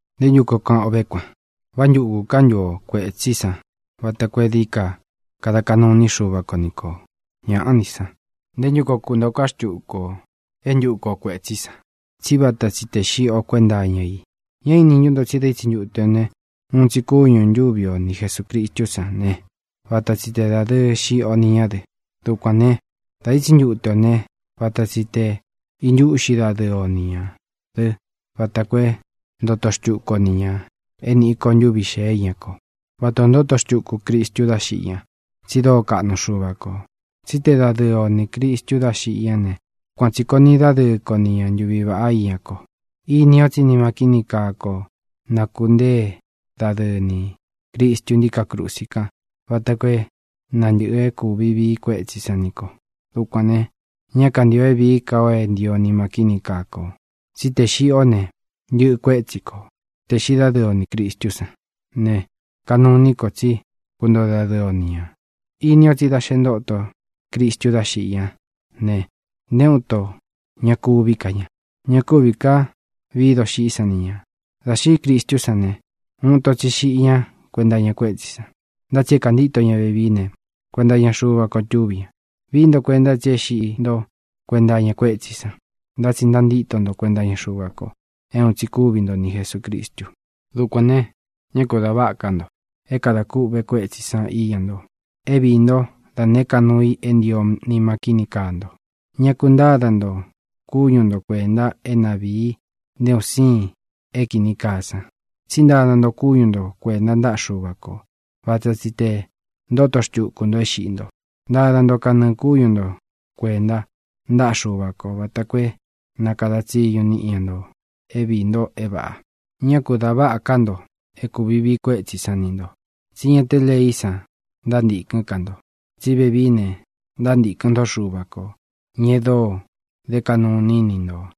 ¿Nté ntu koo kaꞌan o vé kuan? ¿Vá ntukū ká ntu o kuētsí san vata koo é dií ka kada kaꞌnu iní Xuva ko ni kō? ¡Ñāꞌá ni san! ¿Nté ntu koo kuntōo ká xtuku ō é ntuku o kuētsí san?, tsí vata tsi tē xiꞌi o kuénta iña i. ¿Ñá īni ntú nto tsí dā ítsi ntute ō ne, uun tsi kúñū ntúvi o ni Jesūcristú san ne, vata tsi te dādɨɨ xiꞌi o ni ñá dɨ? Dukuān né, dā ítsi ntute ō né, vata tsi tē intúꞌxi dadɨɨ o ni ñā dɨ́ vata koo é ntoto xtuku o ni ñā é nīꞌi ko ntuví xēé iña ko, váta ō ntóto xtuku Cristu dá xiꞌi ñá, tsi dóo kaꞌnu Xuva kō. Tsí te dadɨɨ o nī Cristu dá xiꞌi ñá ne, kuan tsī koo niꞌi dádɨɨ ko ni ña ntuvi vāꞌá iña ko. Ini o tsí nima kíni kaa ko nakūnteé dadɨɨ nī Cristu ntíkā krusi kan vata koo é na ntɨ̄ꞌɨ é kūvi vií kuétsī san ni ko. Dukuān ne, ña kantío é vīí ka ō é ntio nima kíni kaa kō. Tsí tē xiꞌi ó ne, ntɨꞌɨ kuétsi kō. Tē xiꞌi dádɨɨ o nī Cristú san ne, kanuu iní kō tsí kuntoo dadɨɨ o ni ñā. Ini o tsí da xe ntóto Cristu dá xiꞌi ñá ne, nté uun ito ña kuví ka ña. Ña kúvī ká vii doxiꞌí san ni ñā. Dā xiꞌí Cristú san ne, uun ito tsi xiꞌi ñá kuenta iña kuétsī san. Ntá tsi é kāntíto ña vevií ne, kuenta iña Xuva ko túvi ña. Vií nto kuenta tsi é xiꞌi ntó kuenta iña kuétsī san, ntá tsi ntantíto nto kuenta iña Xuva ko, é uun tsi kúvi nto ni Jesūcristu. Dukuān ne, ñá ku da váꞌa ká nto é kadā kûꞌve kuétsī san íña nto é viī ntó da nēé ka nuu i é ntio nima kíni kaa nto. Ña ku ntáda nto kúñu nto kuēnta é na vīi nté un siin é kīni kaa san. Tsí ntada nto kúñu nto kuēnta ntáꞌa Xuva kō. Vata tsi tē ntóto xtuku nto é xiꞌi nto. Ntada nto kanɨɨ kúñu nto kuēnta ntáꞌa Xuva kō vata koo é na kada tsiñu niꞌi ña ntō é viī nto é vāꞌa. Ñá ku dā váꞌa ká nto é kūvi vií kuétsī san ni nto, tsí ña té leí san ntántīkɨ́n ka nto, tsí vevií ne, ntántīkɨn ntó Xuva kō, ña e dóo dé kaꞌnu iní i ni ntō.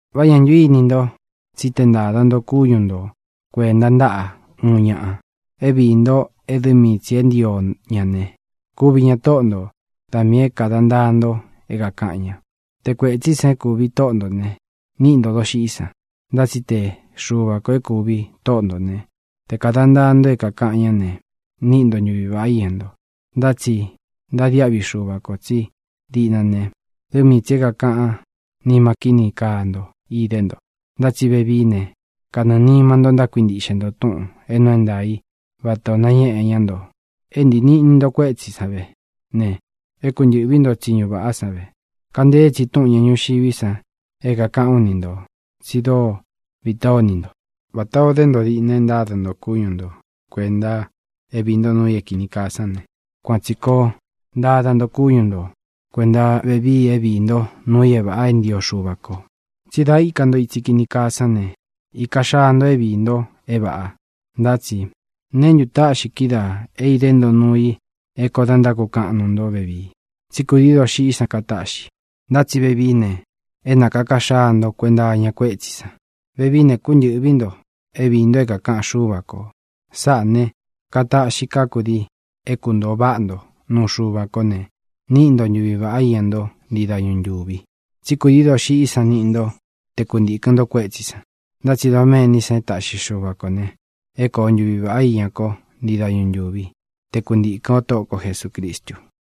Vá ñā ntu íni nto tsí tē ntáda nto kúñu nto kuēnta ntáꞌa uun ñaꞌa é viī nto é dɨ mii tsī e ntío ña ne, kuvi ña tóꞌo ntō. Da miī é kāda ntaa nto é kākaꞌan ña. Te kuētsí san é kūvi tóꞌo ntō ne, níꞌi ntō doxiꞌí san. Ntá tsi te Xuva kō é kūvi tóꞌo ntō né, te kāda ntaa nto é kākaꞌan ñá ne, níꞌi nto ntuvi vāꞌá iña nto. Ntá tsi ntadiáꞌvi Xuva kō tsí diꞌna ne, dɨ mii tsī é kākaꞌán nima kíni kaa nto idé nto. Ntá tsi vevií ne, kanɨɨ̄ nima nto ntákuintiꞌxe nto túꞌūn é nuu é ntaā í vata ō nañéꞌe ñá nto. É ntīi niꞌni nto kuétsī san vé ne, e kúntɨ̄ꞌví nto tsiñu vāꞌá san ve. (Kantée tsi túꞌūn ña ñuxiví san é kākaꞌán u ni ntō tsi dóo vitá o ini nto.) Vatā o dé nto diꞌna e ntáda nto kúñu nto kuēnta é viī ntó nuu i é kīni kaa sán ne, kuan tsī koo ntada nto kúñu nto kuēnta vevii é viī ntó nuu i é vāꞌa é ntio Xuva kō. Tsí dā íka nto itsi kini kaa sán ne, īka xaa nto é viī nto é vāꞌa. Ntá tsi ¿neé ntu taꞌxi kídaā é idé nto nuu i é kōo da ntákukaꞌan nuu nto vevii? Tsí kūdií doxiꞌí san kataꞌxi. Ntá tsi vevií ne, é nākaka xaa nto kuenta iña kuétsī san. Vevií ne, kúntɨ̄ꞌvi nto é viī nto é kākaꞌan Xúva kō. Sáꞌā ne, kataꞌxi ká kudii é kuntōo váꞌa nto nuu Xuva kó ne, níꞌi nto ntuvi vāꞌá iña ntó ntii dañu ntūvi. Tsí kūdií doxiꞌí san niꞌi kó te kuntīkɨn o kuétsī san. Ntá tsi doméní san e táꞌxi Xuva kō ne, é koo ntuvi vāꞌá iña ko ntii dañu ntúvi, te kuntīkɨn o Tóꞌo ko Jesūcristu.